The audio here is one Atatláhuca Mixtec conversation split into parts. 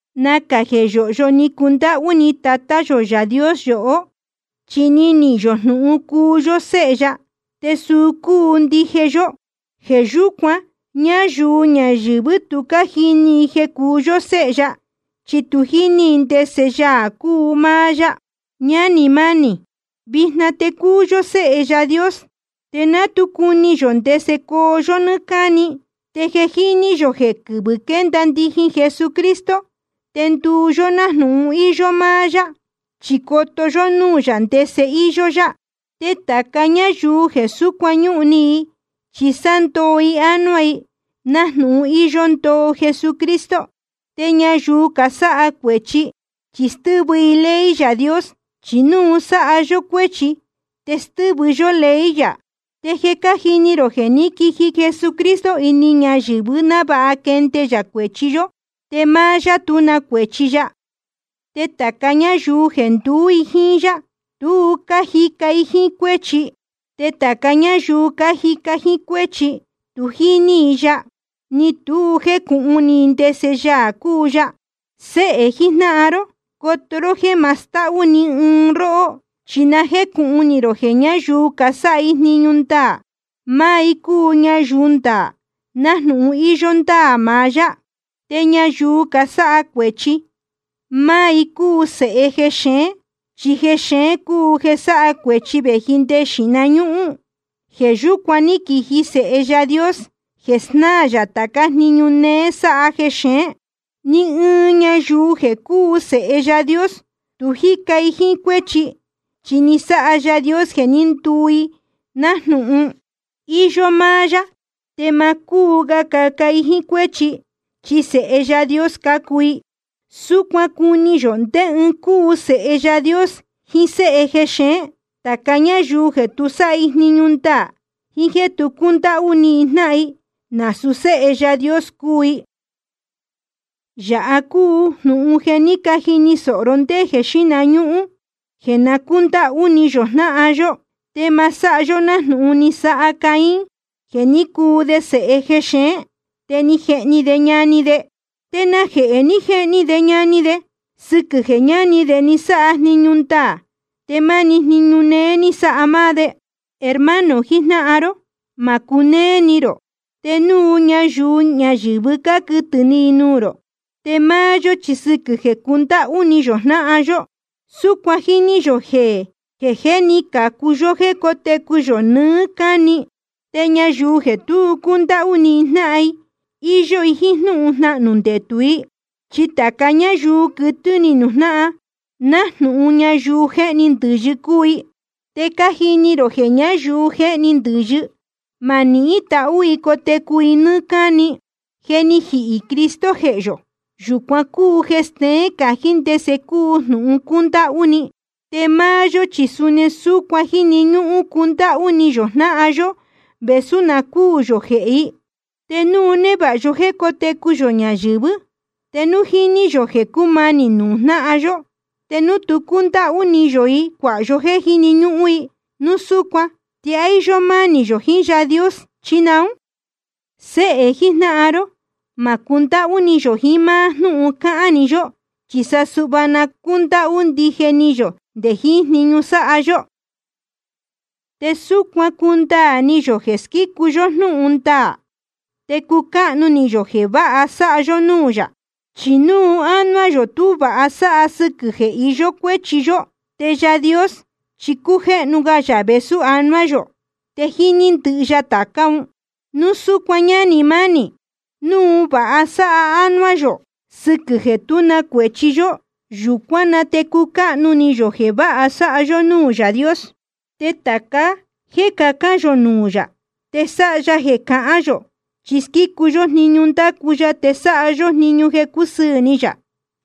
Nacā jeē yóhyo ni cundáhú ni Tatá yō Yaā Dios yohó, chi ni nihīn yō jnūhun cuu yó séhe ya, te suu cúu ndije yó. Jeē yúcuan, ñáyuu ñayɨ̄vɨ́ tu cájini i jeē cúu yó séhe ya, chi tu jíní i ndese Yaā cúu máá yá. Ñánī mánī, vijna te cúu yó séhe Yaā Dios, te ná tu cuni yō ndese coo yó nɨ́ɨ́ cáni. Te je jíní yō jeē quɨvɨ̄ quénda ndijin Jesucristo, te nduu yó nájnūhun íyó máá yá, chi coto yó núū yā ndese íyó yá. Te tāca ñáyuu jeē súcuan ñúhun ni i, chi sándoo i ánuá i, nájnūhun íyó ndoo Jesucristo. Te ñayuu casáha cuēchi, chi stɨ́vɨ i ley Yaā Dios. Chi núu sáha yó cuéchi, te stɨ́vɨ yó ley yā. Te je cájini rō jeē ní quiji Jesucristo ini ñayɨ̄vɨ návāha quende yā cuēchi yó. Te máá yá tú na cuēchi ya. Te tāca ñáyuu jeē nduú i jíín yá, tu cájica i jíín cuéchi. Te tāca ñáyuu cájica jíín cuéchi, tu jíní i ya, ni tu jécūhun ni i ndese Yaā cúu ya. Séhē jijnáhan ró, coto ró jéē ma stáhú ni ɨɨn i róhó. Chi na jécūhun ni rō jeē ñáyuu casáha jniñu ndaā, máá i cácuu ñayuu ndaā, nájnūhun íyó ndáā maá yá. Te ñayuu casáha cuēchi, máá i cácuu sēhe jexeén. Chi jexeén cúu jeē sáha cuēchi vēji nde jeē xíhna ñúhún. Jeē yúcuan ní quiji Sēhe Yaā Dios, jeē snáā yā tācá jniñu néé sáha jexeén. Ni ɨɨn ñayuu jeē cúu sēhe Yaā Dios, tu jíca i jíín cuéchi, chi ni sáha Yaā Dios jeē ní nduu i nájnūhun íyó máá yá. Te ma cúu ga caca i jíín cuéchi, chi sēhe Yaā Dios cácuu i. Súcuan cuni yō ndé ɨɨn cúu sēhe Yaā Dios jiín séhe jexeén: Tāca ñáyuu jeē tu sáha jniñu ndaā, jíín jéē tu cúndáhú ni jnáhan, nasūu séhe Yaā Dios cúu i. Yāha cúu jnūhun jeē ní cajini sōho ró ndé jeē xíhna ñúhún: jeē na cúndáhú ni yō jnáhan yó. Te ma sáha yó nájnūhun ni sáha Caín, jeē ní cuu de sēhe jexeén, te ni jehni de ñani de. ¿Te najehē ni jehni de ñani de? Sɨquɨ̄ jeē ñani de ni sáha jniñu ndaā te máni jniñu néé ní sáha máá de. Hermano jijnáhan ró, ma cunéé ni rō te núu ñayuu ñayɨ̄vɨ cáquɨtɨ̄ ni i nuū rō. Te máá yó chi sɨquɨ̄ jeē cundáhú ni yō jnáhan yó, súcuan jíní yō jeē jé ni cācu yó jéē cótecu yō nɨɨ́ cáni. Te ñayuu jeē tu cúndáhú ni jnáhan, íyó i jíín jnúhun jnahnū ndetū i. Chi tāca ñáyuu quɨtɨ́ ni nuū jnáhan, nájnūhun ñayuu jéhni ndɨ̄yɨ cúu i. Te cájini rō jeē ñáyuu jéhni ndɨ̄yɨ, ma nihín tahú i cotecu i nɨ́ɨ́ cáni. Jeē ni jíhī Cristo jehē yō, yūcuan cúu jeē steén cají ndese cúu jnūhun cúndáhú ni. Te máá yó, chi suni súcuan jíni ñúhún cundáhú ni yō jnáhan yó vēsú na cúū yō jehē i. Te núu névāha yó jéē cótecu yō ñayɨ̄vɨ́, te núu jíní yō jeē cúmanī nuū jnáhan yó, te núu tú cundáhú ni yō i cuāha yó jéē jíni ñúhún i, núu súcuan ¿te á íyó mánī yō jiín Yaā Dios, chi naún? Séhē jijnáhan ró, ma cundáhú ni yō jiín máá jnúhun cáhán‑ni yó, chi sa suhva na cúndáhú ndije ni yō nde jiín jniñu sáha yó. Te súcuan cundaā ni yō jeē squícu yó jnúhun ndaā, te cucáhnu ni yō jeē váha sáha yó núū yā. Chi núu ánuá yō tú vāha sáha sɨquɨ̄ jeē iyó cuéchi yó, te Yaā Dios chi cújéhnu ga yā vēsú anuá yō, te jíní ndɨhɨ ya tācá un. Núu súcuan ñánī mánī, núu vāha sáha ánuá yō sɨquɨ̄ jeē tú na cuēchi yó, yūcuán na te cúcáhnu ni yō jeē váha sáha yó núū Yaā Dios. Te tāca jéē cacán yō nuū yā, te sáha ya jeē cahán yō, chi squícu yó jniñu ndácu ya te sáha yó jniñu jeē cúsɨɨ̄ ni yā.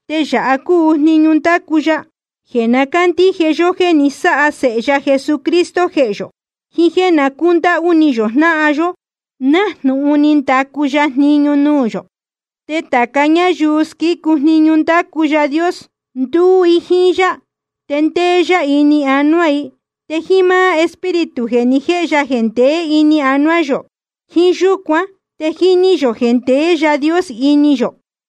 Te yāha cúu jniñu ndácu ya: jeē na cándíje yó jéē ni sáha Sēhe ya Jesucristo jehē yō, jiín jéē na cúndáhú ni yō jnáhan yó, nájnūhun ni ndacu ya jniñu nuū yō. Te tāca ñáyuu squícu jniñu ndácu Yaā Dios, ndúú i jíín yá, te ndéé yá ini anuá i. Te jíín máá Espíritu jeē ni jéhe ya jeē ndeé ini anuá yō, jíín yúcuan te jíní yō jeē ndeé Yaā Dios ini yō.